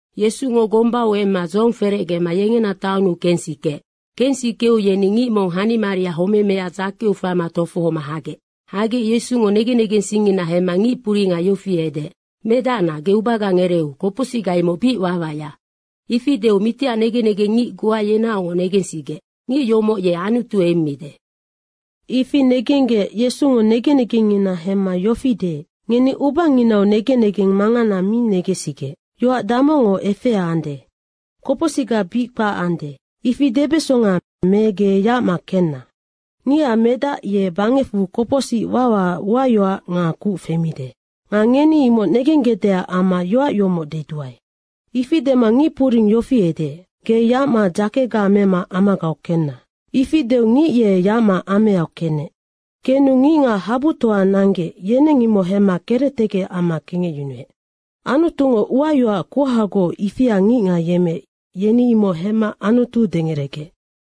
Yesungo gombau emma dzohong ferecgema yengena taonnu kensikeec. Kensikeu yeni ngic mong hanimaria homemea dzakeu faima tofohoma hagec. Hagec Yesungo negen negensingngina hemma ngic puringa yofi edeec, “Medacna, ge ubaga ngereeu, kopocsicga imoc bic wawaya.” Ifi deu mitiac negen negengngic goa yenaocngoc negensigec, “Ngic yomoc ye Anutu emmide.” Ifi negenggec Yesungo negen negengngina hemma yofi deec, “Ngeni ubanginau negen negeng mangana mi negensigec. Yoac damocngo efea ande, ‘Kopocsicga bic kpac ande.’ ifi debesonga me ‘Ge yacma kenna.’ Ngicac Medac ye bangecfu kopocsic wawaac uayoac nga kuc femide. Nga ngeni imoc negenggecdeac amma yoac yomoc deduae.” Ifi dema ngicpuring yofi edeec, “Ge yacma dzakega mema amagau kenna.” Ifi deu ngic ye yacma ameau kenec. Kenu ngicngac habutoa nanggec, yeneng imoc hemma kerectegec amma kengecyunuec. Anutungo uayoac kuhagoc ifia ngicngac yemmeec, yeni imoc hemma Anutu dengeregec.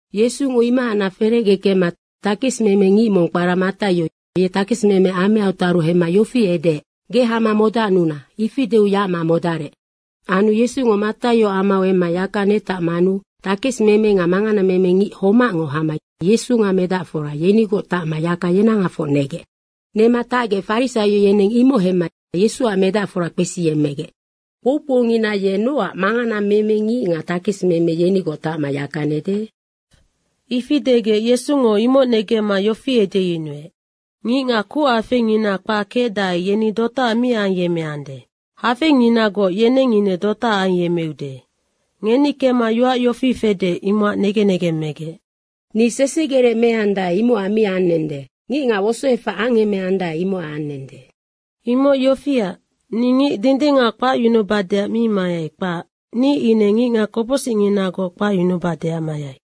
Yesungo imohacnac ferecge kemma takesimemengic mong kpara Mataio, ye takesimeme amau taru hemma yofi edeec, “Ge hama modacnuna.” Ifi deu yacma modarec. Anu Yesungo Mataioac amau emma yaka netacmanu takesimeme nga manganameme ngic homacngo hama Yesu nga medacfora yenigoc tacma yaka yenahafoc negec. Nema tacgec farisaio yeneng imoc hemma Yesuac medacfora kpesiyemmegec, “Kpoukpoungina ye nocac manganameme ngic nga takesimeme yenigoc tacma yaka nede?” Ifi degec Yesungo imoc negemma yofi edeyunuec, “Ngicngac kuchafeingina kpac kecdae, yeni dotaac mi ayemmeande. Hafeinginagoc, yeneng ine dotaac ayemmeude. Ngeni kemma yoac yofi fede, imocac negen negeng megec, ‘Ni sesegerec meandae, imocac mi anende. Ngicngac wosoefac angemeandae, imocac anende.’ Imoc yofiac, ni ngic dindingac kpacyunubadeac mi mayai, kpac. Ni ine ngicngac kopocsicnginagoc kpacyunubadeac mayai.”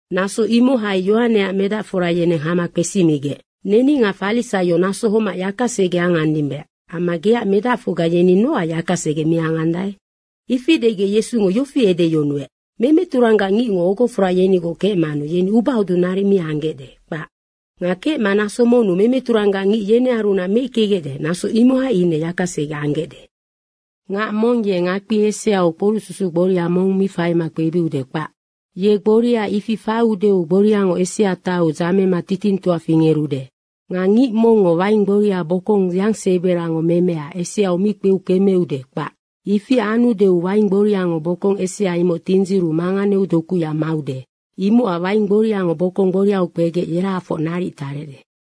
Naso imohai Yohaneac medacfora yeneng hama kpesimigec, “Neni nga farisaio naso homac yakasege angandimbe amma geac medacfocga yeni nocac yaka sege mi angandae?” Ifi degec Yesungo yofi edeyunuec, “Memeturanggac ngicngo ogofora yenigoc kecmanu yeni ubahodung naric mi anggecde, kpac. Nga kecma naso monnu memeturanggac ngic yenearunac meickegecde, naso imohai ine yakasege anggecde. Ngac mong ye ngakpi eseau kporucsusuc gboria mong faima mi kpebiude, kpac. Ye gboria ifi faiudeu gboriango esea taiu dzamema titingtoa fingerude. Nga ngic mongngo waing gboria bokong yangseberango memea eseau mi kpeu kemeude, kpac. Ifi anudeu waing gboriango bokong esea imoc tindziru manganeu dokuya maude. Imocac waing gboriango bokong gboriau kpegec yerahafoc naric tarecde.”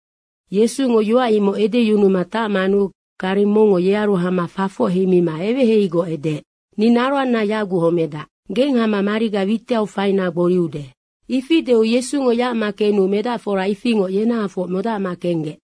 Yesungo yoac imoc edeyunuma tacmanu gareng mongngo yearu hama fafoc heima eweheiheigoc edeec, “Ni naroanna yaguc homedac. Geng hama mariga witiau faina gboriude.” Ifi deu Yesungo yacma kenu medacfora ifingoc yenahafoc modacma kenggec.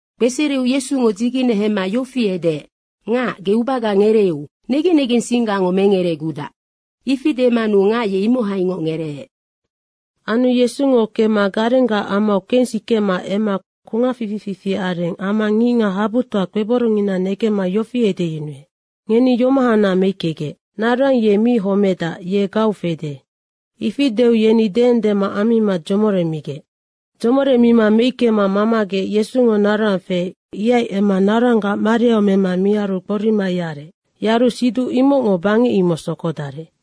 Kpesereu Yesungo dzigene hemma yofi edeec, “Ngac, ge ubaga ngereeu. Negen negensinggango mengeregudac.” Ifi demanu ngac ye imohaingoc ngereec. Anu Yesungo kemma garenggac amau kensikema emma kungac fifi fifi areng amma ngicngac habutoa kpeborongngina negemma yofi edeyunuec, “Ngeni yomohacnac meickegec. Naroang ye mi homedac, ye gau fede.” Ifi deu yeni deendema ammima dzomoremigec. Dzomoremima meickema mamagec, Yesungo naroang feec, ihai emma naroanggac mariau mema miaru gborima yarec. Yaru siduc imocngo bangec imoc sokodarec.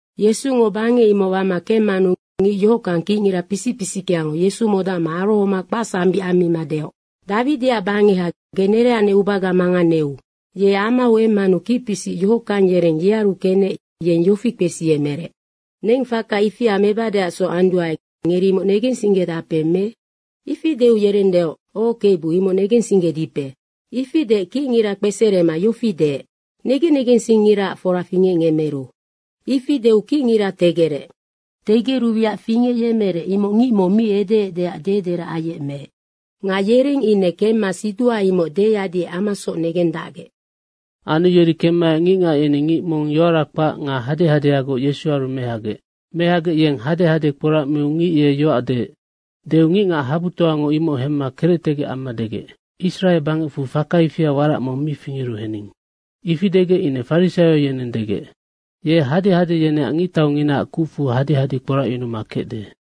Yesungo bangec imoc wama kemmanu ngic yohockang kicngira pisic pisickeango Yesu modacma arohoma kpacsambic ammima deoc, “Dawidiac bangeha, ge nereacnec ubaga manganeu.” Ye amau emmanu kicpisic yohockang yereng yearu kenec yeng yofi kpesiyemerec, “Neng faka ifia mebadeacsoc anduae, ngeri imoc negensinggedape me?” Ifi deu yereng deoc, “Oc Kebu, imoc negensinggedipe.” Ifi deec kicngira kpeserema yofi deec, “Negen negensingngiraac fora fingecngemeru.” Ifi deu kicngira tegerec. Tegeru wiac fingecyemerec, imoc ngic mong mi edeecdeac dederac ayecmeec. Nga yereng ine kemma siduha imoc deyadiec amasoc negendacgec. Anu yeri kemmaec ngicngac yeni ngic mong yoara kpac nga hadehadeagoc Yesuaru mehagec. Mehagec yeng hadehade kporacmiu ngic ye yoac deec. Deu ngicngac habutoango imoc hemma kerectegec amma degec, “Israe bangecfu faka ifia warac mong mi fingeru hening.” Ifi degec ine farisaio yeneng degec, “Ye hadehade yeneac ngictaunginaac kucfu hadehade kporacyunuma kecde.”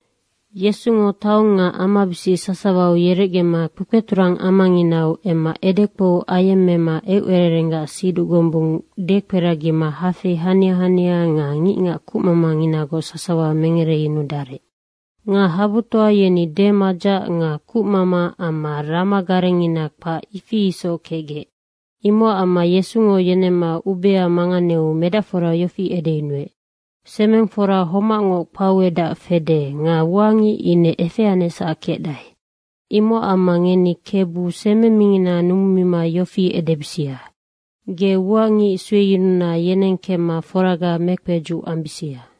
Yesungo taong nga amabisic sasawau yerecgema kpekpeturang amanginau emma edekpou ayemmema eucererenggac siduc gombung dekperagima hafei hania hania nga ngicngac kucmamanginagoc sasawa mengereyunudarec. Nga habutoa yeni demadzac nga kucmama amma rama garengngina kpac, ifi isoc kecgec. Imocac amma Yesungo yenemma ubea manganeu medacfora yofi edeyunuec, “Semeng fora homacngoc kpauedac fede nga uangic ine efeanecsac kecdae. Imocac amma ngeni Kebu, semeng mingina numumima yofi edebisia, ‘Ge ua ngic sueyununa yeneng kemma foraga mekpedzuc ambisia.’”